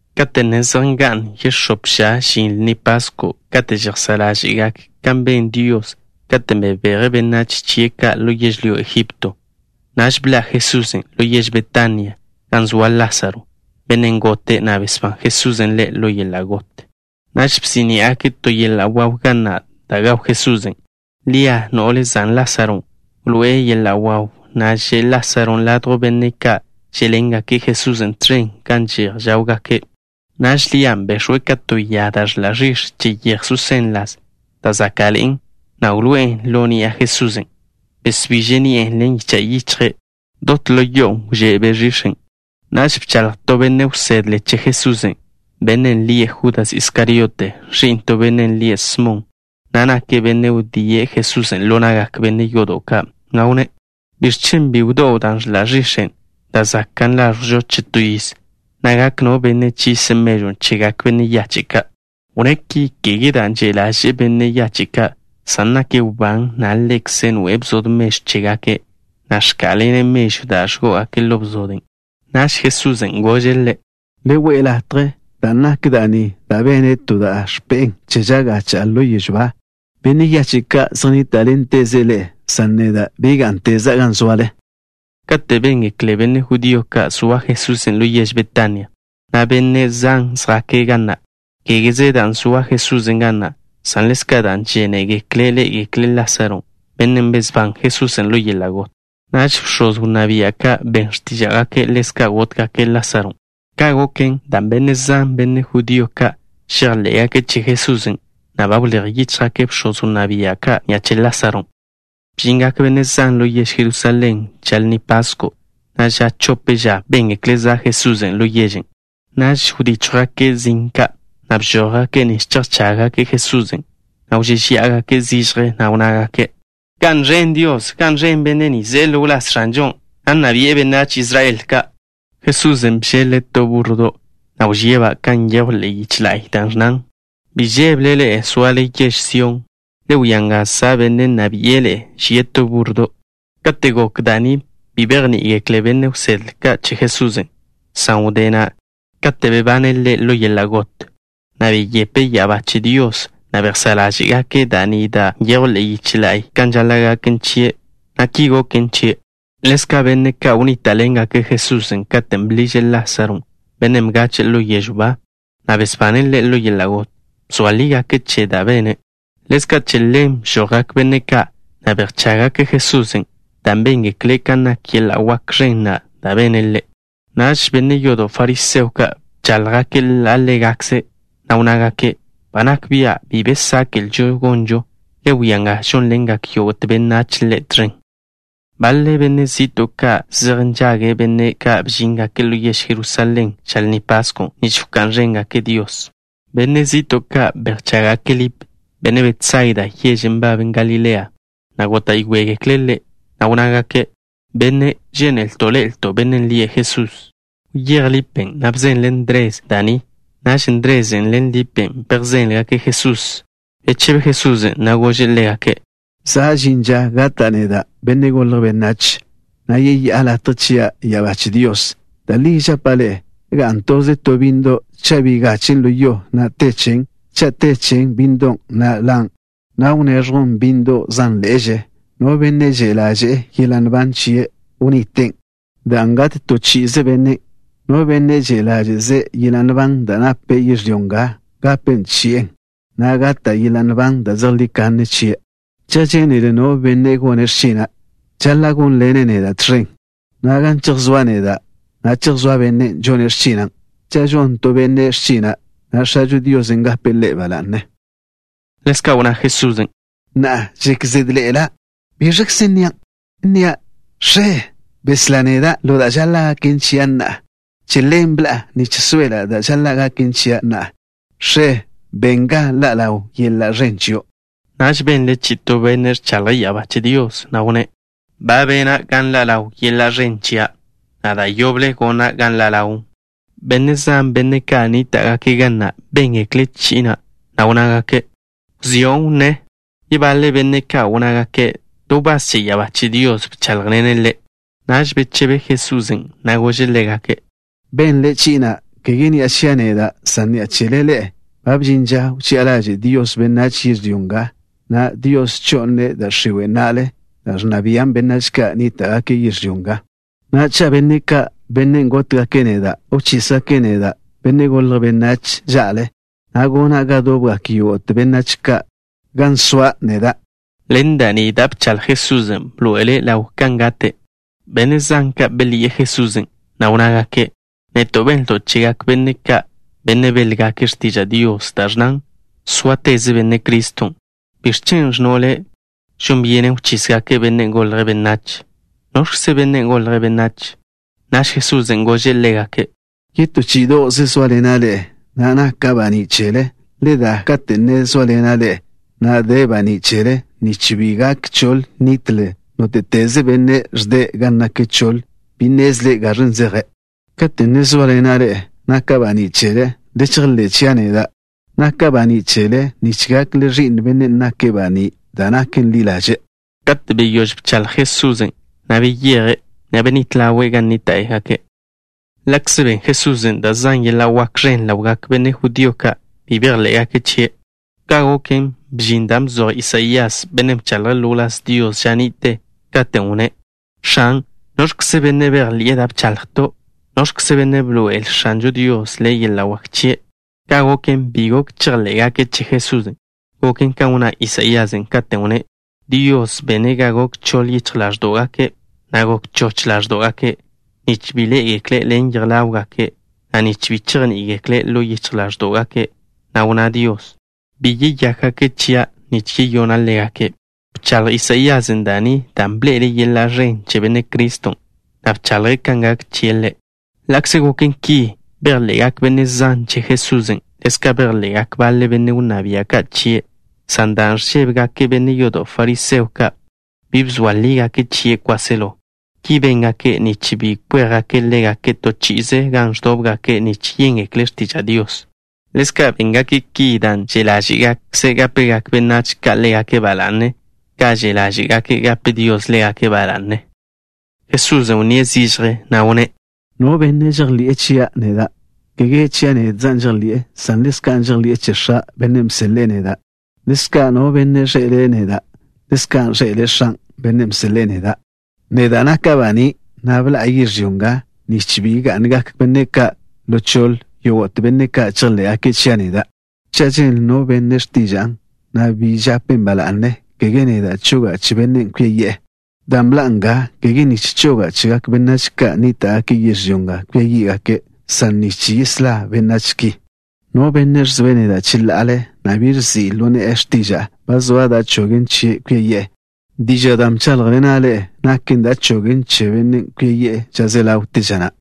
Kate' ne zej nga'n yex̱óp ža žin Lni Pasko' kate' žejsá' ḻáže'gake' kan ben Dios katen' bebeje' benách chie' ka' ḻo yežlyó Egipto, bḻa' Jesusen' ḻo yež Betania, gan zoa Lásaro, bennen' gote', na' besbán Jesusen' ḻe' ḻo yeḻa' got. Naž bsí'ni'agake' to yeḻa' waw ga na' da' gaw Jesusen'. Lia, no'le zan Lásaron', wloé'e yeḻa' wawn', na' že' Lásaron' ladjw benne' ka' žé'ḻengake' Jesusen' tẕen, gan že'j žáwgake'. Naž Lian' bex̱we' ka to ya da' ẕḻa' ẕix̱ che yeje susén ḻas, da' záka'ḻe'en, na' wloé'en ḻo ni'a Jesusen'. Besbiže' ni'e ḻen yicha' yichje'. Dot ḻo yo'on' wžé' be' ẕix̱en'. Naž bchaḻj to benne' wsedle che Jesusen', bennen' lie' Judas Iskariote, ẕi'n to benne' lie' Smon, na' nake' bennen' wdíe' Jesusen' ḻo na'gak benne' yodo' ka', na' wnné': —¿Biẕ chen' bi wdó'w da' ẕḻa' ẕix̱en', da' zakan' láẕjwžo che to yiz, na' gak no benne' chise' mežwn' chegak benne' yache' ka'? (Wnné' ki, kege dan' že' ḻaže'e benne' yache' ka', san nake' wbán, na' ḻekze' noe'e bzod mežw chégake', na' ẕká'lane' mežwn' da' ẕgó'ogake' ḻo bzoden'.) Naž Jesusen' gože' ḻe': —Le we'e latje, dan' nak da' ni da' bene' to da' ẕpe'en che ža gacha'a ḻo yežw ba. Benne' yache' ka' zej nníta'ḻenteze' ḻe'e, san neda' bi gá'nteza' gan zoale. Kate' béngekle benne' judío ka' zoa Jesusen' ḻo yež Betania, benne' zan žjake' ga na', kégeze dan' zoa Jesusen' ga na', san ḻezka' dan' žénegekle' ḻé'egekle' Lásaro, bennen' besbán Jesusen' ḻo yeḻa' got. Naž bx̱oz wnná bia' ka' ben x̱tíža'gake' ḻezka' gótgake' Lásaron'. Ka' goken dan' benne' zan, benne' judío ka', žejḻé'gake' che Jesusen', na' ba wléj yíchjgake' bx̱oz wnná bia' ka' ni'a che Lásaron'. Bžingak benne' zan ḻo yež Jerusalén ža Lni Pasko', na' ža chope ža béngekle' za' Jesusen' ḻo yežen'. Naž wdíchjwgake' zin ka', na' bžójgake' nich chejchággake' Jesusen', na' wžéžeya'agake' zižje, na' wnnágake': —¡Ga'n ẕen Dios! ¡Ga'n ẕen Benne' ni ze'e ḻo wláz X̱anžon', na' nna bi'e benách Israel ka'! Jesusen' bžeḻ-le' to búrrodo', na' wžíe'-ba' kan nyejw ḻe'e yiche la'y, da' ẕnnan: Bi žébele ḻe'e, zoale yež Sión. Le wia nga, za' Benne' nna bi'e ḻe'e. Žie' to búrrodo'. Kate' gok da' ni, bi bejní'igekle benne' wsedle ka' che Jesusen', san wdé na', kate' bebane' Ḻe' ḻo yeḻa' got, na' beyepe' ya'abá che Dios, naž bejsá' ḻáže'gake' da' ni da' nyejw ḻe'e yiche la'y kan žaḻa' gaken chie', na' ki goken chie'. Ḻezka' benne' ka' wnníta'ḻengake' Jesusen' katen' bḻiže' Lásaro, bennen' bgache'e ḻo yežw ba, na' besbane' ḻe' ḻo yeḻa' got, bzoa lígake' che da' bene'. Ḻezka' che ḻen bžojgak benne' ka', na' bejchággake' Jesusen', dan' béngekle' kan nak yeḻa' wak ẕen na' da' bene' Ḻe'. Naž benne' yodo' fariseo ka' bcháḻjgake' ḻa' ḻégakze', na' wnnágake': —Nak bia' bi be sáke'lžo gonžo. Le wia kan žónḻengak yógo'te benách Ḻe' tẕen. Baḻe benne' zi'to' ka' zej nžage' benne' ka' bžíngake' ḻo yež Jerusalén ža Lni Paskon' nich wká'n ẕéngake' Dios. Benne' zi'to' ka' bejchággake' Lip, benne' Betsaida, yežen' nbaben Galilea, na' góta'yoegekle' ḻe', na' wnnágake': —Benne', žénelto' ḻe'elto' Bennen' lie' Jesús. Wyéj Lipen', na' bzenle' Ndres da' ni. Naž Ndrezen' ḻen Lipen' bejzéngeklen' Jesusen'. Bechebe Jesusen', na' gože' ḻégake': —Za' žin ža gata' neda', Benne' Golje' Benách, na' yeyá'a latje chia' ya'abá che Dios. Da' li žapa' ḻe'e: ga'n toze to bínnedo' cha' bi gachen' ḻo yo, na' te chen. Cha' te che bínnedon', ḻan', na' wneẕjwn bínnedo' zánḻe'eže. No benne' že' ḻáže'ze' yeḻa' nban chie', wniten', dan' gat to chi'ize bennen'. No benne' bi že' ḻáže'ze' yeḻa' nban da' nape' yežlyó nga gape chi'en, na' gata' yeḻa' nban da' zejlí kanne chie'. Cha' žénele no benne' gone' x̱china', žaḻa' gónḻene' neda' tẕen, na' gan chejsóa' neda', chejsóa bennen' žone' x̱china'. Cha' žon to benne' x̱china', X̱ažo Dios gape' ḻe' ba la'ne. Ḻezka' wnná Jesusen': —Na'a žek zédḻe'ela'. ¿Biẕkze nnia'? ¿Nnia': X̱e, beslá neda' ḻo da' žaḻa' gaken chia' na'a? Che ḻen bḻa'a, nich soela' da' žaḻa' gaken chia' na'a. X̱e, ben ga ḻa' ḻaw yeḻa' ẕen chio'. Naž benle chi'i to Benne' ẕchaḻje' ya'abá che Dios, na' wnné': —Ba bena' ga nḻa' ḻaw yeḻa' ẕen chia', na' da' yoble gona' ga ḻa' ḻawn. Benne' zan, benne' ka' nníta'gake' ga na', béngekle' chi'i na', na' wnnágake': —¡Wzió' wnnén! Yebaḻe benne' ka' wnnágake': —To wbás che ya'abá che Dios bcháḻjḻene' Ḻe'. Naž bechebe Jesusen', na' gože' ḻégake': —Benle chi'i na', kege ni'a chia' neda', san ni'a chele ḻe'e. Ba bžin ža wchi'a ḻaže' Dios benách yežlyó nga. Na'a Dios cho'ne' da' x̱iwe' na'le, dan' ẕnna bian' benách ka' nníta'gake' yežlyó nga. Na'a, cha' benne' ka', benne' gótgake' neda', wchísgake' neda', Benne' Golje' Benách, ža'le, gona' ga dobgak yógo'te benách ka' gan soa' neda'. Ḻen da' ni da' bchaḻj Jesusen' bḻoe'ele' ḻaw kan gate'. Benne' zan ka' belyi'e Jesusen', na' wnnágake': —Neto' benlto' chegak benne' ka', benne' béḻgake' x̱tiža' Dios, da' ẕnnan: “Sóateze Benne' Criston'.” ¿Biẕ chen' ẕnno' Le': “Žon byenen wchísgake' Benne' Golje' Benách?” ¿Noẕkzen' Benne' Golje' Benách? Naž Jesusen' gože' ḻégake': —Yetó chí'ido'ze sóaḻena' ḻe'e, na' naka' baní' chele. Le da kate' ne zóaḻena' ḻe'e, na' de banín' chele, nich bi gak choḻ nitle. Nóte'teze benne' ẕde' gan nak choḻ bi nnezle' gan zeje'. Kate' ne zóaḻena' ḻe'e, naka' baní' chele. Le chejḻé' chia' neda', naka' baní' chele nich gakle ẕi'n Bennen' nake' banín' da' naken ḻi ḻaže'. Kate' beyóž bchaḻj Jesusen', beyeje', na' benít ḻawe' gan nníta'gake'. Ḻa'kze ben Jesusen' da' zan yeḻa' wak ẕen ḻawgak benne' judío ka', bi bejḻé'gake' chie'. Ka' goken, bžin dan' bzoj Isaías, bennen' bchaḻje' ḻo wláz Dios ža ni'te, katen' wnné': X̱an, ¿noẕkze benne' bejḻi'e da' bchaḻjto'? ¿Noẕkze benne' bḻoe'el X̱anžo Dios ḻe' yeḻa' wak chie'? Ka' goken, bi gok chejḻé'gake' che Jesusen'. Goken kan wnná Isaíasen' katen' wnné': Dios bene' ga gok choḻ yichj ḻáẕdo'gake', na' gok choch ḻáẕdo'gake' nich bi ḻé'egekle' ḻen yej ḻáwgake', na' nich bi chejní'igekle' ḻo yichj ḻáẕdo'gake'. Na' wnná Dios: Bi yeyákgake' chia' nich yeyona' ḻégake'. Bchaḻj Isaíasen' da' ni dan' bḻe'ele' yeḻa' ẕen che Benne' Criston', na' bchaḻje' kan gak chie' Ḻe'. Ḻa'kze goken ki, bejḻe'gak benne' zan che Jesusen'. Ḻezka' bejḻe'gak baḻe benne' wnná bia' ka' chie', san dan' ẕžébegake' benne' yodo' fariseo ka', bi bzoa lígake' chie' kwáselo. Ki béngake' nich bi kwéjgake' ḻégake' to chi'ize gan ẕdóbgake' nich yéngekle' x̱tiža' Dios. Ḻezka' béngake' ki dan' že' ḻáže'gakže' gápegak benách ka' ḻégake' ba la'ne, ka že' ḻáže'gake' gape Dios ḻégake' ba la'ne. Jesusen' wnníe' zižje, na' wnné': —No benne' žejḻi'e chia' neda', kege chia' nedza' žejḻi'e, san ḻezka' žejḻi'e che X̱a', Bennen' bseḻe'e neda'. Ḻezka', no benne' ẕḻe'ele' neda', ḻezka' ẕḻe'ele' X̱an', Bennen' bseḻe'e neda'. Neda' naka' baní', na' bḻa'a yežlyó nga, nich bi ga'ngak benne' ka' ḻo choḻe, yógo'te benne' ka' chejḻé'gake' chia' neda'. Cha' ženle no benne' x̱tiža'a, na' bi žapen' ba la'ne, kege neda' choga' che bennen' kwia yi'e, dan' bḻa'a nga, kege nich choga' chegak benách ka' nníta'gake' yežlyó nga kwia yí'gake', san nich yeslá' benách ki. No benne' ẕzoe' neda' cheḻa'ale, na' bi ẕzi' ḻo ne'e x̱tiža'a, ba zoa da' chogen chie' kwia yi'e. Dižan' dan' bcháḻjḻena' ḻe'e naken da' chogen che bennen' kwia yi'e ža ze ḻawte ža na'.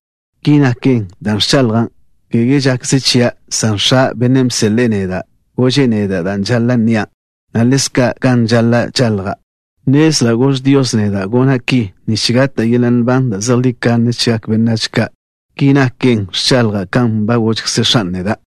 Ki naken dan' ẕchaḻja', kege žakze chia', san X̱a', Bennen' bseḻe'e neda', gože' neda' da' žaḻa' nnia', na' ḻezka' kan žaḻa' wchaḻja'. Nnezla' gož Dios neda' gona' ki nich gata' yeḻa' nban da' zejlí kanne chegak benách ka'. Ki naken, ẕchaḻja' kan ba gožkze X̱an' neda'.